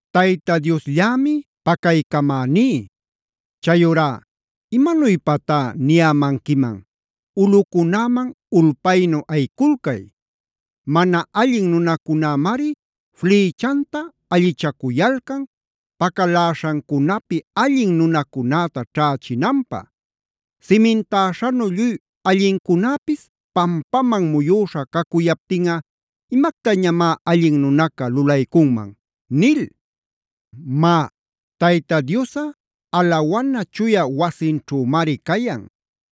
Tayta Diosllämi pacaycamäní. Chayurá, ¿imanuypatá niyämanquiman? “Ulꞌucunäman ulpaynu ayiculcay. Mana allin nunacunämari flïchanta allichacuyalcan, pacaläśhancunapi allin nunacunäta ćhächinanpä. Simintäśhanu lluy allincunäpis pampaman muyüśha cacuyaptinꞌa ¿imactañamá allin nunaca lulaycunman?” nil. Má, Tayta Diosꞌa alawana chuya wasinćhümari cayan.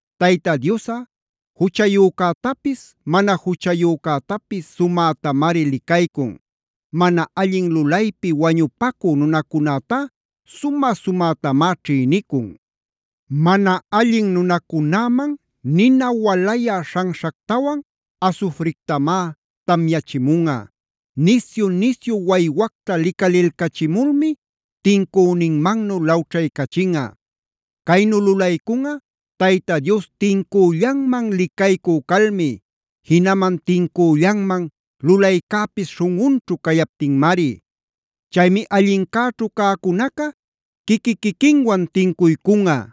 Tayta Diosꞌa juchayücätapis mana juchayücätapis sumätamari licaycun. Mana allin lulaypi wañupacü nunacunätá sumä-sumätamá ćhïnicun. Mana allin nunacunäman nina walayä śhanśhactawan asufrictamá tamyachimunꞌa. Nisyu-nisyu waywacta licalilcachimulmi tincüninmannu lawćhaycachinꞌa. Caynu lulaycunꞌa Tayta Dios tincüllanman licaycü calmi; jinaman tincüllanman lulaycäpis śhunꞌunćhu cayaptinmari. Chaymi allincäćhu cäcunaca quiqui-quiquinwan tincuycunꞌa.